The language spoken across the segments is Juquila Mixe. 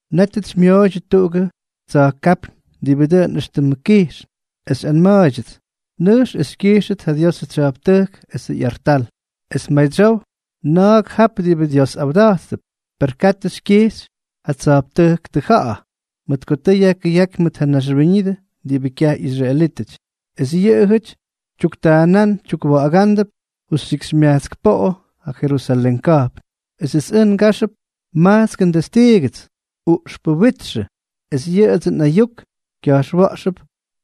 Nétʉts xymyooydyʉ tuꞌugʉ tsa̱jkápyñ diꞌibʉ dʉꞌʉn éxtʉmʉ kijxn, es xyꞌanma̱a̱ydyʉts: —Nʉjx es xykyijxʉt ja Diosʉ tsya̱jptʉjk esʉ ꞌyartal, es madsyow na̱a̱k jap diꞌibʉ Dios awda̱jttʉp. Per katʉ xykyijxy ja tsa̱jptʉjk tʉja̱ꞌa̱, mʉt ko tʉ yajkʉyáky mʉt ja naxwíñʉdʉ diꞌibʉ kyaj ꞌyisraelítʉty. Es yʉꞌʉjʉty tyuktaanán tyukwa̱ꞌa̱gándʉp justyikxymyajtsk poꞌo ja Jerusalén ka̱jpn. Esʉts ʉj ngáxʉp majtskʉ ndestiigʉts, uꞌxpʉ witxʉ, es yʉꞌʉdsʉ nꞌayuk kya̱jxwa̱ꞌxʉp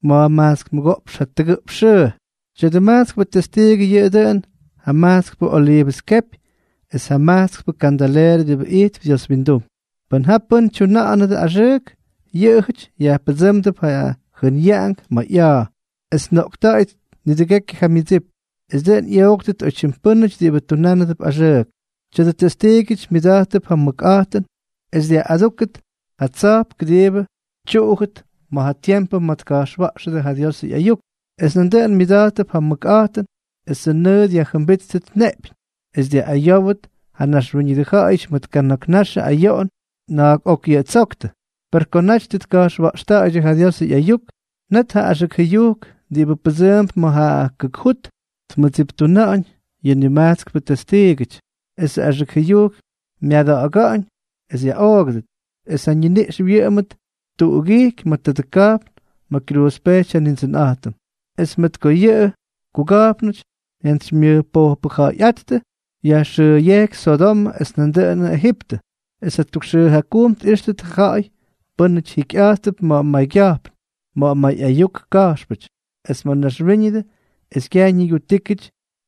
ma̱jmajtsk mʉgoꞌpx jatʉgʉꞌpx xʉʉ. Tya̱dʉ majtskpʉ testiigʉ yʉꞌʉ dʉꞌʉn ja majtskpʉ oliivʉs kepy es ja majtskpʉ kandaleerʉ diꞌibʉ ijtp Dios windum. Pʉn ja pʉ́n tyuna̱ꞌa̱nʉdʉ axʉʉk, yʉꞌʉjʉty yajpʉdsʉ́mdʉp ja jʉnyaꞌank ma̱ ꞌya̱a̱, es tnoꞌkta̱ꞌa̱yʉt nidʉgekyʉ ja myʉdsip. Esʉ dʉꞌʉn ꞌyooktʉt oytyim pʉ́nʉty diꞌibʉ tunánʉp axʉʉk. Tya̱dʉ testiigʉty myʉda̱jttʉp ja mʉkꞌa̱jtʉn es dyaꞌꞌadúkʉt ja tsa̱jp kʉdiibʉ tyuꞌujʉt ja tiempʉ ma̱ tka̱jxwa̱ꞌxʉdʉ ja Diosʉ ꞌyayuk. Es nan myʉda̱jttʉp ja mʉkꞌa̱jtʉn esʉ nʉʉ dyajjʉmbítʉt neꞌpyñ, es dyaꞌꞌayówdʉt ja naxwíñʉdʉ ja̱ꞌa̱yʉty mʉt kana̱k naxʉ ayoꞌon na̱a̱k ok yʉꞌʉ ttsoktʉ. Per ko naty tʉ tka̱jxwa̱ꞌxta̱ꞌa̱ydyʉ ja Diosʉ ꞌyayuk, net ja axʉk jʉyujk diꞌibʉ pʉdsʉʉmp ma̱ ja kʉk jut tmʉttsiptuna̱ꞌa̱ñ yʉ nimajtskʉ testiigʉty, esʉ axʉk jʉyujk myada̱ꞌa̱ga̱ꞌa̱ñ es yaꞌoogʉdʉt, es ja ñiniꞌx wyʉꞌʉmʉt tuꞌugijky ma̱ tadʉ ka̱jpn ma̱ kyruuzpejty ja Nindsʉnꞌa̱jtʉm. Es mʉt ko yʉ kuga̱jpnʉty jyantsymyʉjpojpʉja̱ꞌa̱yꞌáttʉ, yajxʉʉyejky Sodomʉ es nandʉꞌʉn Ejiptʉ. Es tʉgʉk xʉʉ jakujm tꞌíxtʉt ja ja̱ꞌa̱y pʉ́nʉty jikyꞌa̱jttʉp ma̱ maygya̱jpn, ma̱ may ayuk ka̱jxpʉty, es ma̱ mayñaxwíñʉdʉ, es kyaj ñigutíkyʉty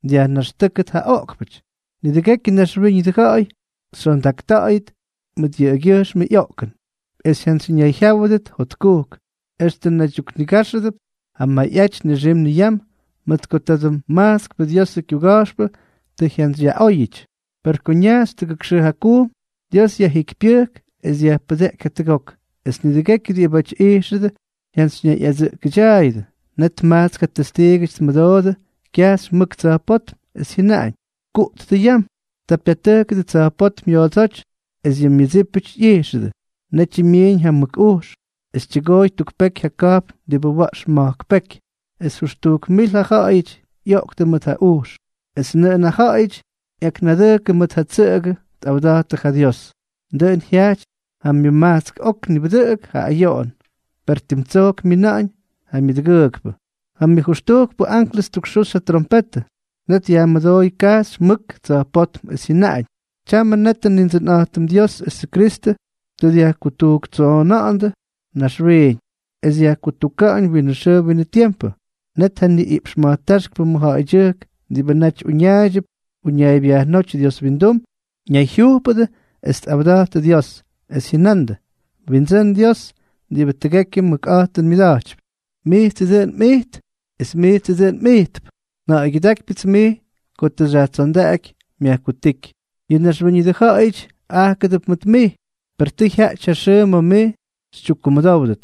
dyajnaxtʉ́kʉdʉ tadʉ oꞌkpʉty. Nidʉgekyʉ naxwíñʉdʉ ja̱ꞌa̱y xyondakta̱ꞌa̱yʉt mʉt yʉꞌʉgyʉjxmʉ ꞌyoꞌkʉn, es jyantsyñayjyáwʉdʉt jotkujk, extʉ naydyuknigáxʉdʉp ja mayꞌaty nixim niyam mʉt ko tadʉ majtskpʉ Diosʉ kyuga̱jxpʉ tʉ jyantsyyaꞌꞌayóyʉty. Per ko ñajxy tʉgʉk xʉʉ jakujm, Dios yajjikypyʉjk es dyajpʉdeꞌky jatʉgok. Es nidʉgekyʉ diꞌibáty ijxʉdʉ jyantsyñayꞌadsʉꞌkʉdyaayʉdʉ. Net majtsk ja testiigʉty tmʉdoodʉ kyajxy mʉk tsa̱jpótm, es jyʉnaꞌañ: —¡Kuꞌttʉ yam! Ta pyatʉjkʉdʉ tsa̱jpótm yoodsóty, es yʉ myʉdsípʉty ꞌyijxʉdʉ. Netyʉ myiiñ ja mʉk ujx, es tyʉgooy tuk peky ja ka̱jpn diꞌibʉ wa̱ꞌx ma̱jk peky. Es jʉxtujk mil ja ja̱ꞌa̱yʉty ꞌyoꞌktʉ mʉt ja ujx. Es nʉꞌʉn ja ja̱ꞌa̱yʉty ꞌyaknadʉjkʉ mʉt ja tsʉꞌʉgʉ tꞌawda̱jttʉ ja Dios. Dʉꞌʉn jyajty ja myʉmajtsk ok nibʉdʉꞌʉk ja ayoꞌon. Per tim tsojk myina̱ꞌa̱ñ ja myʉdʉgʉʉkpʉ. Ja myʉjʉxtujkpʉ anklʉs ttukxuxy ja trompetʉ. Net yajmʉdooy kajxy mʉk tsa̱jpótm, es jyʉnaꞌañ: Tyamʉ netʉ Nindsʉnꞌa̱jtʉm Dios esʉ Kyristʉ tʉ dyajkutujktsoona̱ꞌa̱ndʉ naxwiiñ, es yajkutuka̱ꞌa̱ñ winʉ xʉʉ winʉ tiempʉ. Net ja niꞌiꞌpx ma̱jtáxkpʉ mʉjja̱ꞌa̱ydyʉjk diꞌibʉ naty uñaaydyʉp uñaaybyajnóty Dios windum, ñayjyujpʉdʉ es tꞌawda̱jttʉ Dios, es jyʉna̱ꞌa̱ndʉ: Windsʉ́n Dios diꞌibʉ tʉgekyʉ mʉkꞌa̱jtʉn mmʉda̱jtypy, mijtsʉ dʉꞌʉn mꞌijt, es mijts dʉꞌʉn mꞌijtp. Nja̱ꞌa̱ygyʉdákypyʉts mij ko tʉ xyajtsondaꞌaky myajkutíky. Yʉ naxwíñʉdʉ ja̱ꞌa̱yʉty ajkʉdʉp mʉt mij. Per tʉ jyaꞌty ja xʉʉ ma̱ mij xytyukkumʉdówʉt.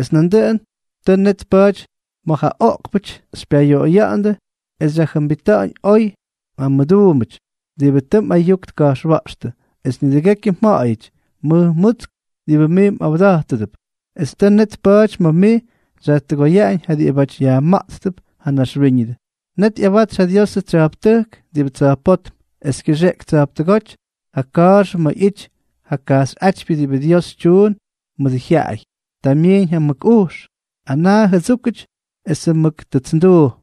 Es nandʉꞌʉn tʉ net tpa̱a̱ty ma̱ ja oꞌkpʉty xypyayoꞌoya̱ꞌa̱ndʉ es xyajjʉmbita̱ꞌa̱ñ oy ja mmʉduumbʉty diꞌibʉ tʉ mꞌayuk tka̱jxwa̱ꞌxtʉ, es nidʉgekyʉ mja̱ꞌa̱yʉty, mʉj mutsk, diꞌibʉ mij mꞌa̱wda̱jtʉdʉp, es tʉ net tpa̱a̱ty ma̱ mij xyajtʉgoyaꞌañ ja diꞌibáty yajma̱ꞌttʉp ja naxwíñʉdʉ. Net ꞌyawatsy ja Diosʉ tsya̱jptʉjk diꞌibʉ tsa̱jpótm, es kyʉxeꞌky tsa̱jptʉgóty ja ka̱a̱xʉ ma̱ ꞌyity ja kajxyꞌátypyʉ diꞌibʉ Dios tyuun mʉdʉ jyaꞌay. Ta myiiñ ja mʉk ujx, anaa jʉdsúkʉty esʉ mʉk tʉtsnduu.